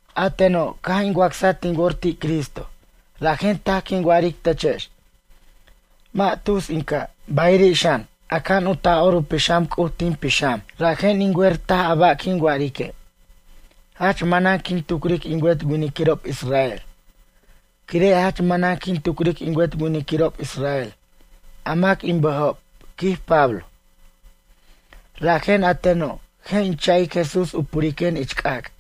A teno', caj in wacsaj tin wor ti' Cristo, rajen taj quin wa'aric techex. Mʌ' tus in ca'. Bayiri' xan, aca'an u Taj'or u Pixam C'uj tin pixam, rajen in wer taj a ba' quin wa'arique'. Jach manan quin tucric in wet winiquirob israel. Quire' jach manan quin tucric in wet winiquirob israel, a mac in bʌjob, quij Pablo. Rajen a teno', je' in cha'ic Jesús u puriquen ich c'ac',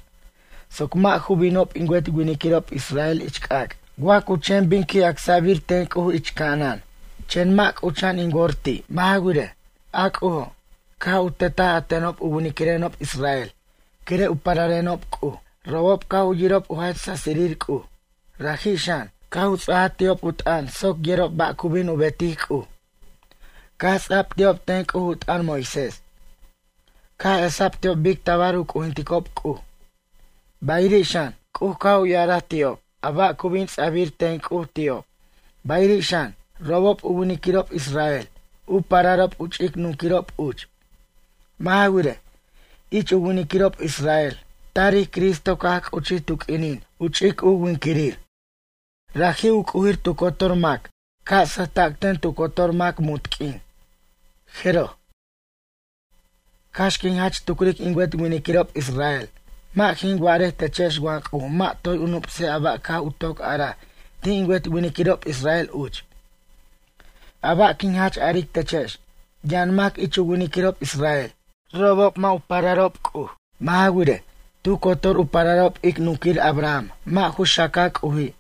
soc mʌ' ju binob in wet winiquirob israel ich c'ac', wa cu chen bin qui' acsa'bir ten C'uj ich ca'anan, chen mʌ' c'ucha'an in wor ti'. Mʌ' ja wirej, a C'ujo', caj u tetaj a tenob u winiquirenob israel quire' u pararenob C'uj. Robob caj yirob u jach sasirir C'uj. Raji' xan, caj u ts'aja ti'ob u t'ʌn soc yerob ba' cu bin u betic C'uj. Caj ts'a'b ti'ob ten C'uj u t'ʌn Moisés. Caj esa'b ti'ob bic tabar u c'ujinticob C'uj. Bayiri' xan, C'uj caj u ya'araj ti'ob a ba' cu bin ts'a'bir ten C'uj ti'ob. Bayiri' xan, robob u winiquirob israel, u pararob u ch'ic nunquirob uch. Mʌ' ja wirej, ich u winiquirob israel tarij Cristo caj c'uchij tu q'uinin u ch'ic u winquirir. Raji' u c'ujir tu cotor mac, ca' sʌjta'c ten tu cotor mac muntq'uin. Jeroj. Cax quin jach tucric in wet winiquirob israel, mʌ' jin wa'arej techex wa C'uj mʌ' toy u nup'sej a ba' caj u toc araj ti' in wet winiquirob israel uch. A ba' quin jach aric techex, yʌn mac ich u winiquirob israel, robob mʌ' ju pararob C'uj. Mʌ' ja wirej, tu cotor u pararob ic nunquir Abraham mʌ' ju xaca C'uji',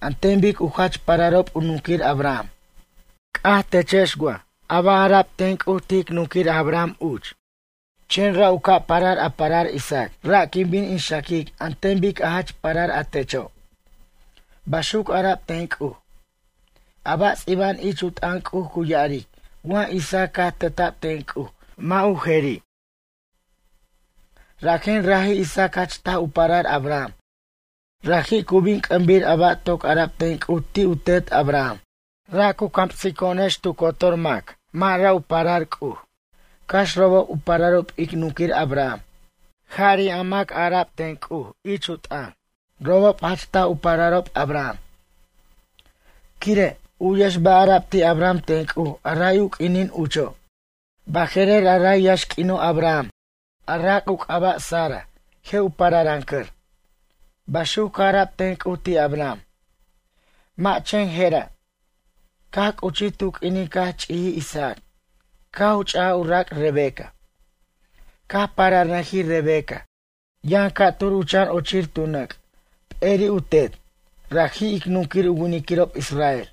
an ten bic u jach pararob u nunquir Abraham. C'aj techex wa ja ba' ara'b ten C'uj ti' ic nunquir Abraham uch? “Chen ra' u ca' parar a parar Isaac, ra' quin bin in xaquic an ten bic a jach parar a techo'.” Baxuc ara'b ten C'uj. A ba' ts'iba'an ich u t'ʌn C'uj cu ya'aric wa Isaac caj teta'b ten C'uj mʌ' ju jeri'. Rajen raji' Isaac jach taj u parar Abraham, raji' cu bin c'ʌmbir a ba' toc ara'b ten C'uj ti' u tet Abraham. Ra' cu camsico'onex, tu cotor mac mʌ' ra' u parar C'uj, cax robob u pararob ic nunquir Abraham. Jari' a mac ara'b ten C'uj ich u t'ʌn, robob jach taj u pararob Abraham. Quire', u'yex ba' ara'b ti' Abraham ten C'uj a ray u q'uinin ucho': “Baje'rer a ray yaxq'uino' Abraham, a rac' u c'aba' Sara, je' u pararʌncʌr.” Baxuc caj ara'b ten C'uj ti' Abraham. Mʌ' chen jera'. Caj c'uchij tu q'uinin caj ch'ijij Isaac, caj u ch'aj u rac' Rebeca. Caj pararnʌjij Rebeca, yʌn ca'tur u chan ochir tu nʌc', p'eri'ob u tet, raji' ic nunquir u winiquirob israel.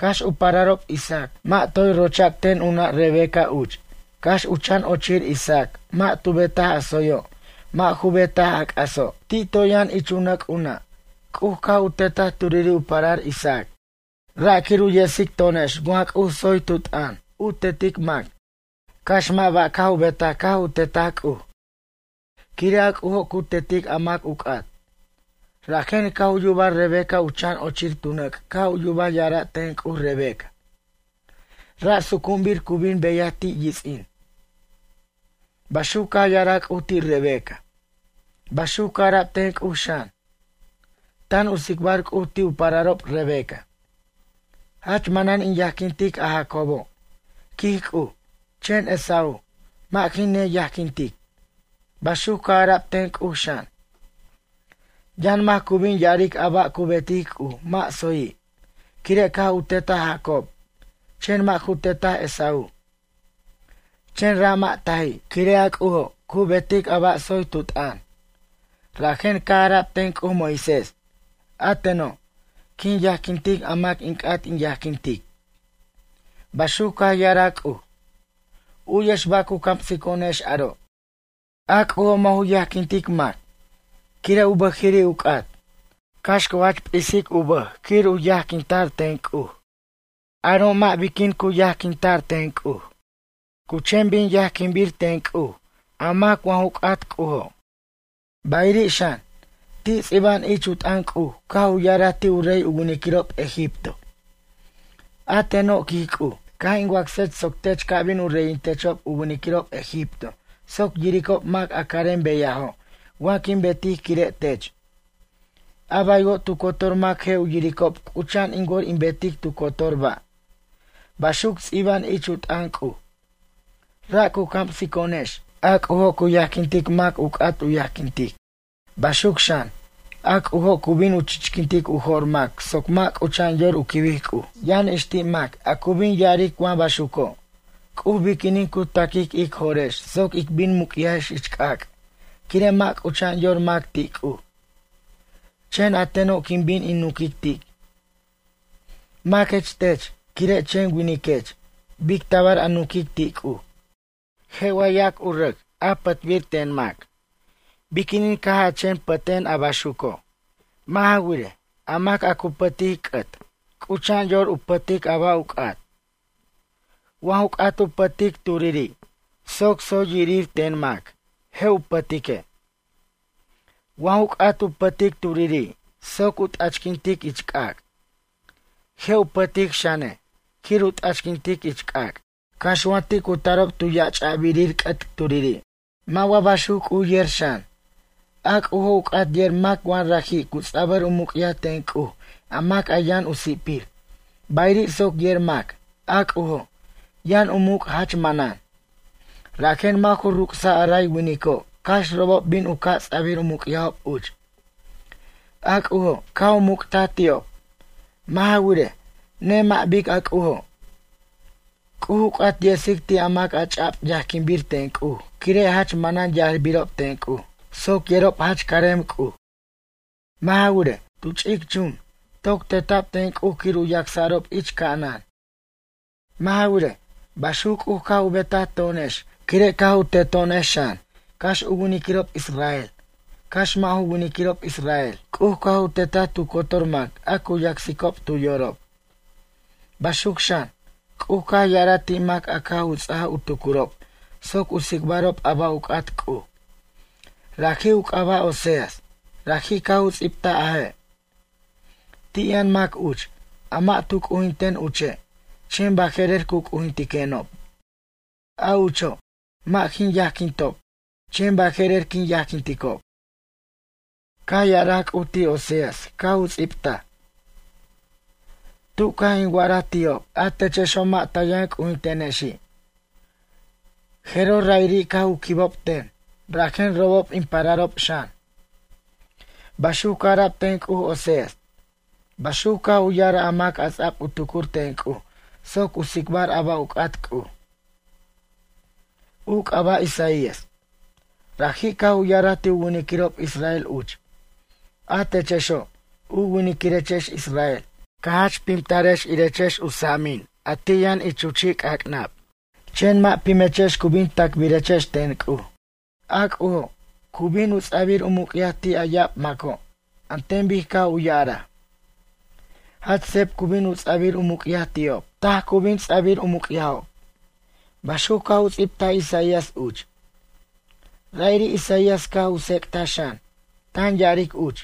Cax u pararob Isaac mʌ' toy rocha'c ten u nʌ' Rebeca uch, cax u chan ochir Isaac mʌ' tu betaj a tsoyo' mʌ' ju betaj a c'aso', ti' toy yʌn ich u nʌc' u nʌ', C'uj caj u tetaj turiri' u parar Isaac. Ra' quir u yesic to'onex wa C'uj tsoy tu t'ʌn, u tetic mac, cax mʌ' ba' caj u betaj caj u tetaj C'uj. Quire' a C'ujo' cu tetic a mac u c'at. Rajen caj u yubaj Rebeca u chan ochir tu nʌc' caj yubaj ya'ara' ten C'uj Rebeca: “Ra' sucu'unbir cu bin beyaj ti' yits'in.” Baxuc caj ya'araj C'uj ti' Rebeca. Baxuc caj ara'b ten C'uj xan. Tan u tsicbar C'uj ti' u pararob Rebeca: “Jach manan in yajquintic a Jacobo', quij C'uj, chen Esaú, mʌ' jin neyajquintic.” Baxuc caj ara'b ten C'uj xan. Yʌn mac cu bin ya'aric a ba' cu betic C'uj mʌ' tsoyi', quire' caj u tetaj Jacob, chen mʌ' ju tetaj Esaú. Chen ra' mʌ' taji'. Quire' a C'ujo', cu betic a ba' tsoy tu t'ʌn. Rajen caj ara'b ten C'uj Moisés: “A teno', quin yajquintic a mac in c'at in yajquintic.” Baxuc caj ya'araj C'uj. U'yex ba' cu camsico'onex aro'. A C'ujo' mʌ' ju yajquintic mac, quire' u bʌjiri' u c'at, cax cu jach p'is u bʌj quir u yajquinta'r ten C'uj. Aro' mʌ' biquin cu yajquinta'r ten C'uj. Cu chen bin yajquinbir ten C'uj a mac wa ju c'at C'ujo'. Bayiri' xan, ti' ts'iba'an ich u t'ʌn C'uj caj u ya'araj ti' u rey u winiquirob egipto: “A teno', quij C'uj, caj in wacsech soc tech ca bin u reyintiquechob u winiquirob egipto soc yiricob mac a carem beyajo' wa quin betic quire' tech. A baywo' tu cotor mac je' u yiricob c'ucha'an in wor in betic tu cotor ba'.” Baxuc ts'iba'an ich u t'ʌn C'uj. Ra' cu camsico'onex, a C'ujo' cu yajquintic mac u c'at u yajquintic. Baxuc xan, a C'ujo' cu bin u chichquintic u jo'r mac soc mʌ' c'ucha'an yor u quibic C'uj. Yʌn ix ti' mac, a cu bin ya'aric wa baxuco', C'uj biquinin cu taquic ic jo'rex soc ic bin muc'yajex ich c'ac', quire' mʌ' c'ucha'an yor mac ti' C'uj. Chen a teno' quin bin in nunquic ti': “Maquech tech, quire' chen winiquech, bic tabar a nunquic ti' C'uj?” Je' wa yac u rac, a pʌtbir ten mac: “Biquinin caj a chen pʌten a baxuco'?” Mʌ' ja wirej, a mac a cu pʌtic c'ʌt c'ucha'an yor u pʌtic a ba' u c'at. Wa ju c'at u pʌtic turiri' soc tsoy yirir ten mac, je' u pʌtique'. Wa ju c'at u pʌtic turiri' soc u t'achquintic ich c'ac', je' u pʌtic xane', quir u t'achquintic ich c'ac'. Cax wa ti' cu tarob tu yach'abirir c'ʌt turiri'. Mʌ' wa baxuc C'uj yejer xan? A C'ujo', u c'at yer mac wa raji' cu ts'abʌr u muc'yaj ten C'uj a mac a yʌn u si'pir, bayiri' soc yer mac, a C'ujo', yʌn u muc' jach manan. Rajen mʌ' ju ruc'saj a ray winico' cax robob bin u ca' ts'abir u muc'yajob uch. A C'ujo', caj u muc'taj ti'ob. Mʌ' ja wirej, nemʌ' bic a C'ujo'. C'uj u c'at yesic ti' a mac a ch'a'b yajquinbir ten C'uj quire' jach manan yajbirob ten C'uj, soc yerob jach carem C'uj. Mʌ' ja wirej, tu ch'ic chun, toc teta'b ten C'uj quir u yacsa'rob ich ca'anan. Mʌ' ja wirej, baxuc C'uj caj u betaj to'onex quire' caj u teto'onex xan, cax u winiquirob israel, cax mʌ' ju winiquirob israel. C'uj caj u tetaj tu cotor mac a cu yacsicob tu yorob. Baxuc xan, C'uj caj ya'araj ti' mac a caj u ts'aj u tucurob soc u tsicbarob a ba' u c'at C'uj. Raji' u c'aba' Oseas, raji' caj u ts'ibtaj a je': Ti' yʌn mac uch, a mʌ' tu c'ujinten uche', chen baje'rer cu c'ujintiquenob. A ucho', mʌ' jin yajquintob, chen baje'rer quin yajquinticob. Caj ya'araj C'uj ti' Oseas caj u ts'ibtaj: “Tu caj in wa'araj ti'ob: A techexo' mʌ' ta yʌn c'ujintenexi'. Jeroj ra'iri' caj u quibob ten, rajen robob in pararob xan.” Baxuc caj ara'b ten C'uj Oseas. Baxuc caj u ya'araj a mac a ts'ab u tucur ten C'uj soc u tsicbar a ba' u c'at C'uj. U c'aba' Isaías. Raji' caj u ya'araj ti' u winiquirob israel uch: “A techexo', u winiquirechex israel, ca jach pimtarex irechex u sa'amin a ti' yʌn ich u chi' c'ac'nab. Chen mʌ' pimechex cu bin tacbirechex ten C'uj. A C'ujo', cu bin u ts'abir u muc'yaj ti' a ya'ab maco', an ten bic caj u ya'araj. Jach seb cu bin u ts'abir u muc'yaj ti'ob. Taj cu bin ts'abir u muc'yajob.” Baxuc caj u ts'ibtaj Isaías uch. Ra'iri' Isaías caj u tsec'taj xan, tan ya'aric uch: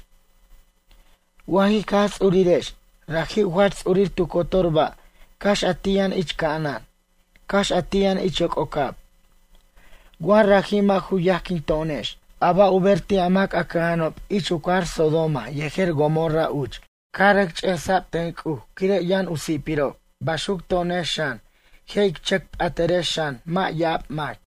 Wa jic Jaj Ts'urirex, raji' u jach ts'urir tu cotor ba', cax a ti' yʌn ich ca'anan, cax a ti' yʌn ich yoc'ocab. Wa raji' mʌ' ju yajquin to'onex, a ba' u ber ti' a mac a cʌja'anob ich u cajar Sodoma yejer Gomora uch, caj rʌc ch'esa'b ten C'uj quire' u yʌn si'pirob baxuc to'onex xan, je' ic chʌc p'atʌrex xan mʌ' ya'ab mac.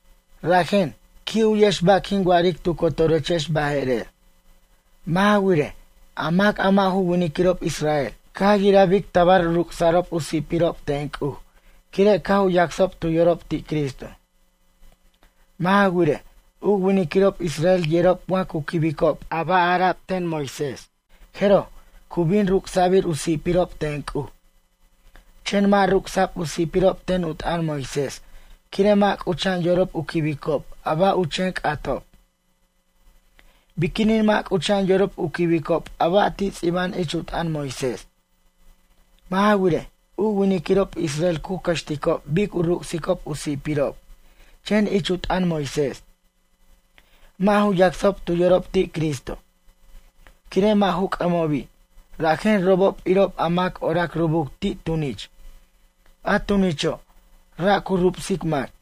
Rajen, qui' u'yex ba' quin wa'aric tu cotorechex baje'rer. Mʌ' ja wirej, a mac a mʌ' ju winiquirob israel, caj yiraj bic tabar u ruc'sa'rob u si'pirob ten C'uj, quire' caj u yacsob tu yorob ti' Cristo. Mʌ' ja wirej, u winiquirob israel yerob wa cu quibicob a ba' ara'b ten Moisés, jeroj, cu bin ruc'sa'bir u si'pirob ten C'uj. Chen mʌ' ruc'sa'b u si'pirob ten u t'ʌn Moisés, quire' mʌ' c'ucha'an yorob u quibicob a ba' u chen c'atob. Biquinin mʌ' c'ucha'an yorob u quibicob a ba' ti' ts'iba'an ich u t'ʌn Moisés? Mʌ' ja wirej, u winiquirob israel cu cʌxticob bic u ruc'sicob u si'pirob chen ich u t'ʌn Moisés. Mʌ' ju yacsob tu yorob ti' Cristo. Quire' mʌ' ju c'ʌmobi', rajen robob irob a mac orac rubuc ti' tunich, a tunicho', ra' cu rubsic mac.